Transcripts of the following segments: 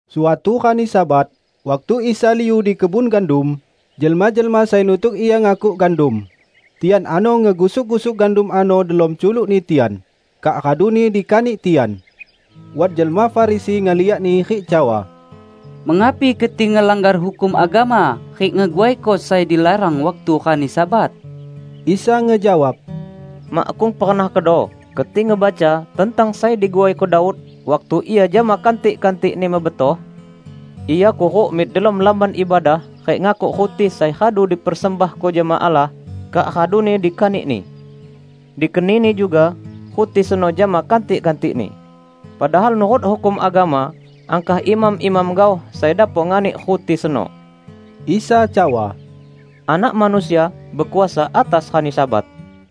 Suatu rani Sabat, waktu Isa liu di kebun gandum, jelma-jelma sai nutuk Ia ngakuk gandum. Tian ano ngegusuk-gusuk gandum ano delom culukni tian, kak raduni dikanik tian. Wat jelma Farisi ngeliakni rik cawa, "Mengapi keti ngelanggar hukum agama rik ngeguaiko sai dilarang waktu rani Sabat?" Isa ngejawab, "Makkung pernah kedo keti ngebaca tentang sai diguaiko Daud, waktu ia jama kantik-kantikni mebetoh? Ia kuruk mik delom Lamban Ibadah rik ngakuk ruti sai radu dipersembahko jama Allah, kak raduni dikanikni. Dikenini juga ruti seno jama kantik-kantikni. Padahal nurut hukum agama angkah imam-imam gaoh sai dapok nganik ruti seno." Isa cawa, "Anak Manusia bekuasa atas rani Sabat!"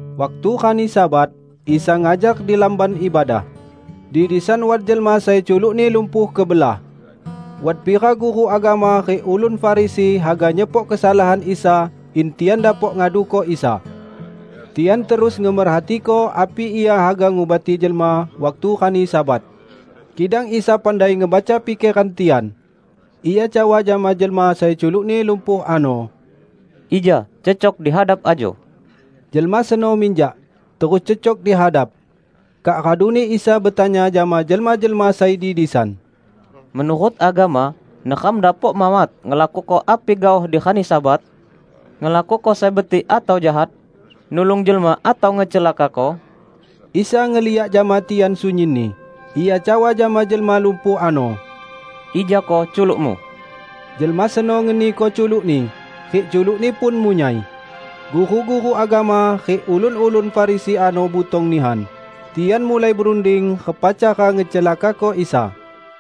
Waktu rani Sabat, Isa ngajar di lamban ibadah. Di disan wat jelma sai culukni lumpuh kebelah. Wat pira guru agama rik ulun Farisi haga nyepok kesalahan Isa in tian dapok ngaduko Isa. Tian terus ngemerhatiko api Ia haga ngubati jelma waktu rani Sabat. Kidang Isa pandai ngebaca pikeran tian. Ia cawa jama jelma sai culukni lumpuh ano, "Ija cecok di hadap ajo!" Jelma seno minjak, terus cecok di hadap. Kak raduni Isa betanya jama jelma-jelma sai di disan, "Menurut agama, neram dapok mawat ngelakuko api gaoh di rani Sabat? Ngelakuko sai betik atau jahat? Nulung jelma atau ngecelakako?" Isa ngeliak jama tian sunyinni, Ia cawa jama jelma lumpuh ano, "Ijako culukmu." Jelma seno ngeniko culukni, rik culukni pun munyai. Guru-guru agama rik ulun-ulun Farisi ano butong nihan, tian mulai berunding repa cara ngecelakako Isa.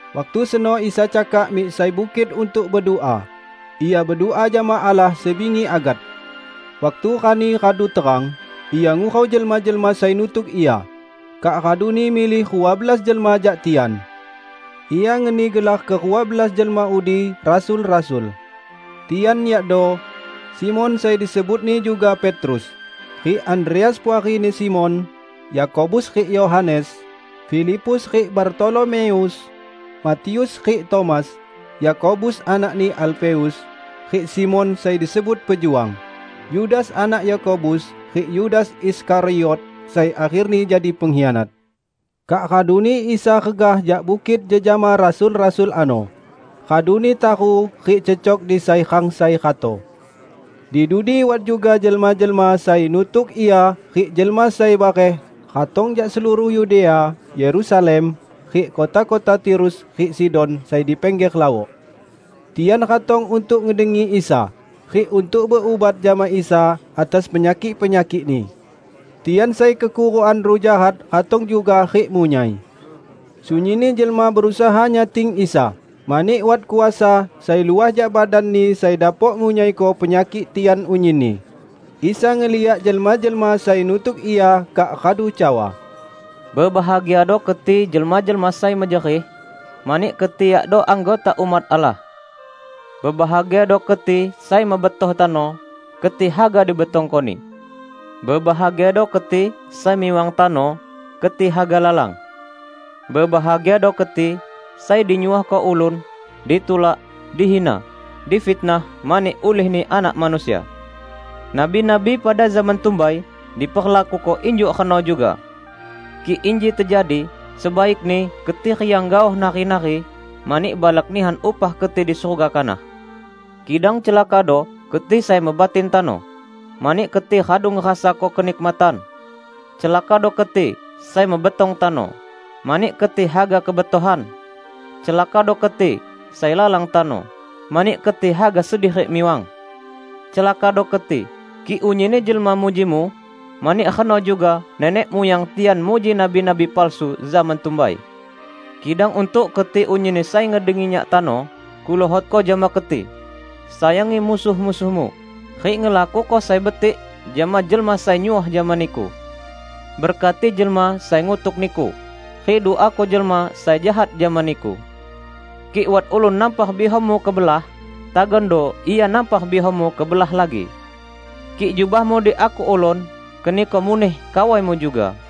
Waktu seno Isa cakak mik sai bukit untuk bedua. Ia bedua jama Allah sebingi agat. Waktu rani radu terang, Ia ngurau jelma-jelma sai nutuk Ia, kak raduni milih rua belas jelma jak tian. Ia ngeni gelar kerua belas jelma udi rasul-rasul. Tian yakdo: Simon (sai disebutni juga Petrus), rik Andreas puarini Simon; Yakobus rik Yohanes, Filipus rik Bartolomeus, Matius rik Tomas, Yakobus anakni Alfeus, rik Simon (sai disebut Pejuang), Yudas anak Yakobus rik Yudas Iskariot sai akherni jadi pengkhianat. Kak raduni Isa regah jak bukit jejama rasul-rasul ano, raduni taru rik cecok di sai rang sai rato. Di dudi wat juga jelma-jelma sai nutuk Ia rik jelma sai bareh ratong jak seluruh Yudea, Yerusalem, rik kota-kota Tirus rik Sidon sai di pingger lawok. Tian ratong untuk ngedengi Isa, rik untuk berubat jama Isa atas penyakik-penyakikni. Tian sai kekurukan ruh jahat ratong juga rik munyai. Sunyinni jelma berusaha nyating Isa, mani wat kuasa sai luah jak badan-Ni sai dapok ngunyaiko penyakik tian unyinni. Isa ngeliak jelma-jelma sai nutuk Ia kak radu cawa, "Bebahagiado keti jelma-jelma sai mejerih, mani keti yakdo anggota umat Allah! Bebahagiado keti sai mebetoh tano; keti haga dibetongkoni! Bebahagiado keti sai miwang tano; keti haga lalang! Bebahagiado keti sai dinyuohko ulun, ditulak, dihina, difitnah mani ulihni Anak Manusia! Nabi-nabi pada zaman tumbai diperlakuko injuk reno juga. Kik inji tejadi, sebaikni keti riang gaoh, nari-nari mani balak nihan upah keti di surga kanah. Kidang celakado keti sai mebatin tano; mani keti radu ngerasako kenikmatan! Celakado keti sai mebetong tano; mani keti haga kebetohan! Celakado keti sai lalang tano; mani keti haga sedih rik miwang! Celakado keti, kik unyinni jelma mujimu; mani reno juga nenek muyang tian muji nabi-nabi palsu zaman tumbai." "Kidang untuk keti unyinni sai ngedengi Nyak tano, Kuluhotko jama keti: sayangi musuh-musuhmu, rik ngelakuko sai betik jama jelma sai nyuoh jama niku. Berkati jelma sai ngutuk niku, rik duako jelma sai jahat jama niku. Kik wat ulun nampar bihammu kebelah, tagando ia nampar bihammu kebelah lagi. Kik jubahmu diakuk ulun, keniko muneh kawaimu juga.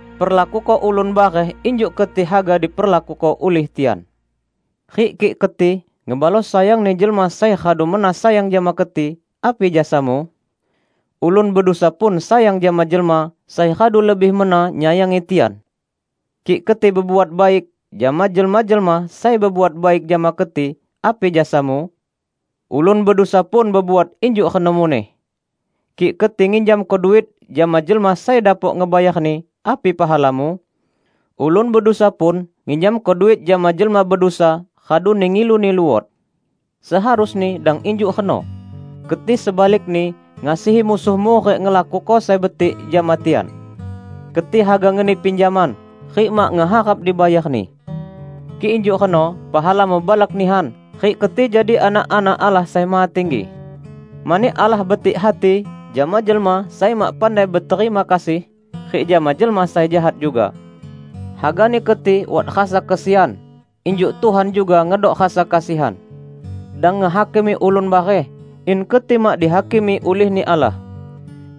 Perlakuko ulun bareh injuk keti haga diperlakuko ulih tian. Rik kik keti ngebalos sayangni jelma sai radu mena sayang jama keti, api jasamu? Ulun bedusa pun sayang jama jelma sai radu lebih mena nyayangi tian! Kik keti bebuat baik jama jelma-jelma sai bebuat baik jama keti, api jasamu? Ulun bedusa pun bebuat injuk reno muneh! Kik keti nginjamko duit jama jelma sai dapok ngebayarni, api pahalamu? Ulun bedusa pun nginjamko duit jama jelma bedusa raduni ngiluni luot. Seharusni dang injuk reno! Keti sebalikni ngasihi musuhmu rik ngelakuko sai betik jama tian. Keti haga ngeni pinjaman, rik mak ngeharap dibayarni. Kik injuk reno, pahalamu balak nihan rik keti jadi anak-anak Allah Sai Mahatinggi. Mani Allah betik hati jama jelma sai mak pandai beterima kasih, rik jama jelma sai jahat juga. Hagani keti wat rasa kesian, injuk Tuhan juga ngedok rasa kasihan." "Dang ngehakimi ulun bareh, in keti mak dihakimi ulihni Allah.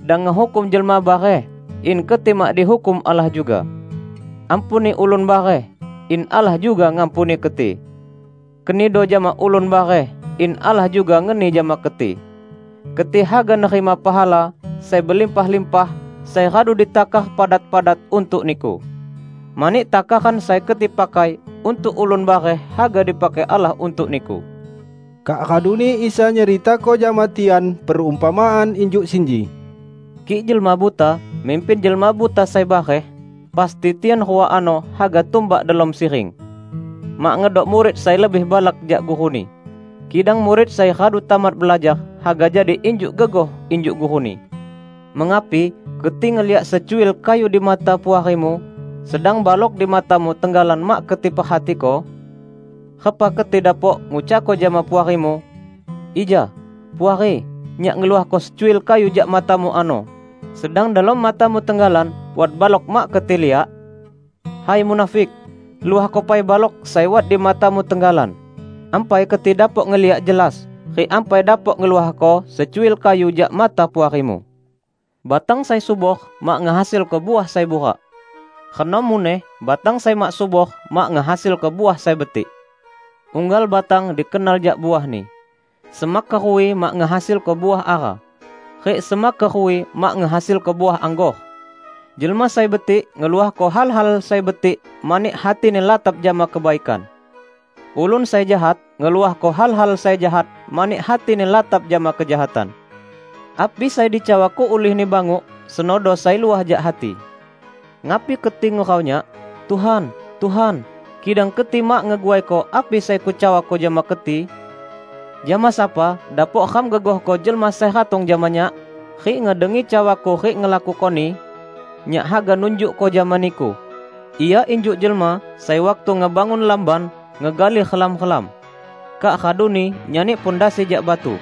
Dang ngehukum jelma bareh, in keti mak dihukum Allah juga. Ampuni ulun bareh, in Allah juga ngampuni keti. Kenido jama ulun bareh, in Allah juga ngeni jama keti; keti haga nerima pahala sai belimpah-limpah sai radu ditakar padat-padat untuk niku. Mani takaran sai keti pakai untuk ulun bareh haga dipakai Allah untuk niku." Kak raduni Isa nyeritako jama tian perumpamaan injuk sinji, "Kik jelma buta mimpin jelma buta sai bareh, pasti tian rua ano haga tumbak delom siring. Mak ngedok murid sai lebih balak jak guruni. Kidang murid sai radu tamat belajar, haga jadi injuk gegoh injuk guruni. Mengapi keti ngeliak secuil kayu di mata puarimu, sedang balok di matamu tenggalan mak keti perhatiko? Repa keti dapok ngucakko jama puarimu, 'Ija, puari, nyak ngeluahko secuil kayu jak matamu ano,' sedang delom matamu tenggalan wat balok mak keti liak? Hai munafik! Luahko pai balok sai wat di matamu tenggalan. Ampai keti dapok ngeliak jelas rik ampai dapok ngeluahko secuil kayu jak mata puarimu." "Batang sai subor mak ngehasilko uah sai burak. Reno muneh batang sai mak subor mak ngehasilko uah sai betik. Unggal batang dikenal jak uahni. Semak keruwi mak ngehasilko uah ara, rik semak keruwi mak ngehasilko uah anggor. Jelma sai betik ngeluahko hal-hal sai betik mani hatini latap jama kebaikan. Ulun sai jahat ngeluahko hal-hal sai jahat mani hatini latap jama kejahatan. Api sai dicawako ulihni banguk senodo sai luah jak hati." "Ngapi keti ngurau Nyak, 'Tuhan, Tuhan,' kidang keti mak ngeguaiko api sai Kucawako jama keti? Jama sapa dapok ram gegohko jelma sai ratong jama Nyak, rik ngedengi cawa-Ku rik ngelakukoni? -- Nyak haga nunjukko jama niku --. Ia injuk jelma sai waktu ngebangun lamban ngegali relam-relam, kak raduni nyani pondasi jak batu.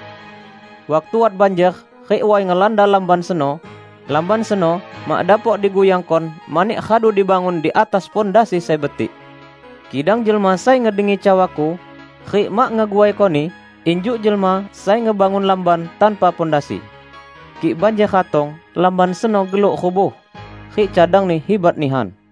Waktu wat banjer rik way ngelanda lamban seno lamban seno mak dapok diguyangkon mani radu dibangun di atas pondasi sai betik. Kidang jelma sai ngedengi cawa-Ku rik mak ngeguaikoni, injuk jelma sai ngebangun lamban tanpa pondasi. Kik banjer ratong, lamban seno geluk rubuh; rik cadangni hibat nihan!"